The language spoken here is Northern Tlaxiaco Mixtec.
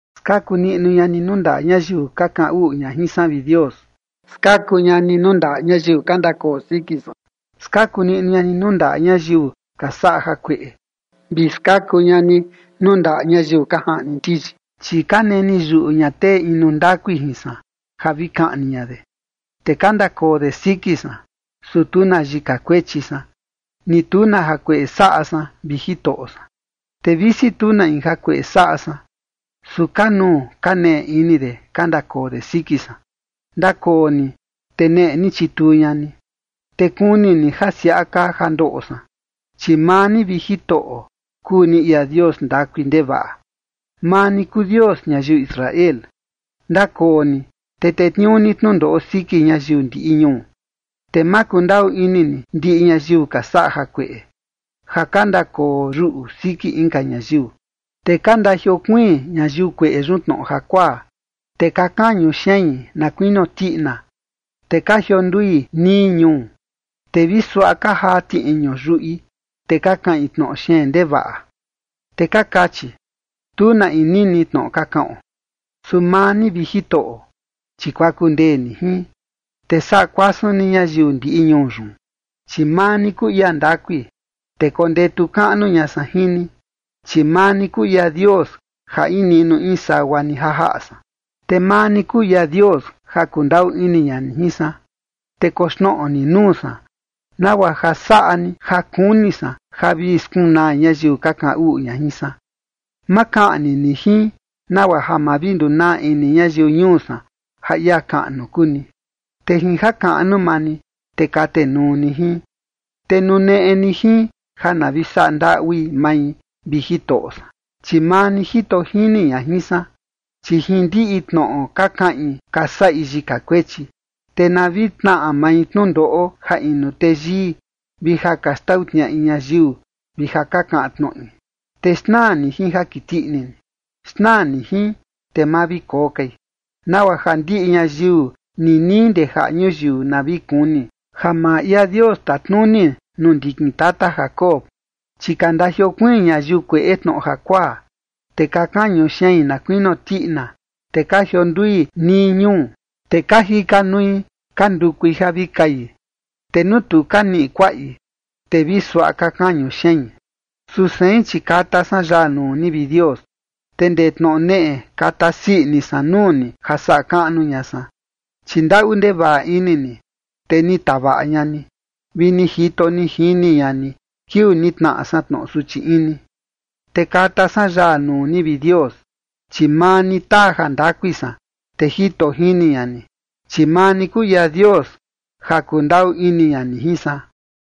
Skaku niꞌnu ña ni nuu ndaꞌa ñayiu ka kaꞌan uꞌu ña jin san, vi Dios. Skaku ña ni nuu ndaꞌa ñayiu ka ndakoo siki san. Skaku niꞌnu ña ni nuu ndaꞌa ñayiu ka saꞌa jakueꞌe, vi skaku ña ni nuu ndaꞌa ñayiu ka jaꞌni ndiyi. Chi ka neni yuꞌu ña tee inu ndakui jin san ja vi kaꞌni ña de, te ka ndakoo de siki san, su tu na yika kuechi san, ni tu na jakueꞌe saꞌa san, vi Jitoꞌo san. Te visi tu na in jakueꞌe saꞌa san, su ka nuu ka neꞌe ini de ka ndakoo de siki san. Ndakoo ni, te neꞌe ni chituu ña ni, te kuni ni ja siaꞌa kaa ja ndoꞌo san. Chi maa ni, vi Jitoꞌo, kuu ni ia Dios ndakui ndevaꞌa. Maa ni kuu Dios ñayiu Israel. Ndakoo ni te tetniuu ni tnundoꞌo siki ñayiu ndiꞌi ñuu, te ma kundaꞌu ini ni ndiꞌi ñayiu ka saꞌa jakueꞌe ja ka ndakoo yuꞌu siki inka ñayiu. Te ka ndajiokuiin ñayiu kueꞌe yun tnoꞌo jakuaa, te ka kañu xein na kuinio tiꞌina, te ka jiondui nii ñuu. Te vi suaꞌa ka jaa tiꞌiñu yuꞌi, te ka kaꞌin tnoꞌo xeen ndevaꞌa, te ka kachi: “Tu na in nini tnoꞌo ka kaꞌon”. Su maa ni, vi Jitoꞌo, chi kuaku ndee ni jin, te saꞌa kuasun ni ñayiu ndiꞌi ñuu yun. Chi maa ni kuu ia ndakui, te kondetu kaꞌnu ña san jin ni, chi maa ni kuu ia Dios ja in niꞌnu in sagua ni ja jaꞌa san. Te maa ni kuu ia Dios ja kundaꞌu ini ña ni jin san, te koxnoꞌo ni nuu san, nagua ja saꞌa ni ja kuni san ja vi skunaa ñayiu ka kaꞌan uꞌu ña jin san. Ma kaꞌni ni jin, nagua ja ma vi ndunaa ini ñayiu ñuu san ja ia kaꞌnu kuu ni. Te jin jakaꞌnu maa ni, te katenuu ni jin. Te nuneꞌe ni jin ja na vi saꞌa ndaꞌui mai, vi Jitoꞌo san, chi maa ni jito jini ña jin san. Chi jin ndiꞌi tnoꞌo ka kaꞌin ka saꞌi yika kuechi. Te na vi tnaꞌa mai tnundoꞌo ja inu teyii vi ja ka xtau tniaꞌi ñayiu vi ja ka kaꞌan tnoꞌi. Te xnaa ni jin ja kiti ini ni. Xnaa ni jin, te ma vi koo kai, nagua ja ndiꞌi ñayiu ninii ndee jaꞌa ñuyiu na vi kuni ja maa ia Dios tatnuni nuu ndikin tata Jacob. Chi ka ndajiokuiin ñayiu kueꞌe tnoꞌo jakuaa, te ka kañu xein na kuinio tiꞌina, te ka jiondui nii ñuu. Te ka jika nui ka ndukui ja vi kai, te nuu tu ka niꞌi kuaꞌi, te vi suaꞌa ka kañu xein. Su sein, chi kata san yaa nuu ni, vi Dios, te ndee tnoꞌo neꞌe kata sii ini san nuu ni ja saꞌa kaꞌnu ña san. Chi ndaꞌu ndevaꞌa ini ni, te ni tavaꞌa ña ni, vi ni jito ni jini ña ni kiuu ni tnaꞌa san tnoꞌo suchi ini. Te kata san yaa nuu ni, vi Dios, chi maa ni taa jandakui san, te jito jini ña ni, chi maa ni kuu ia Dios ja kundaꞌu ini ña ni jin san.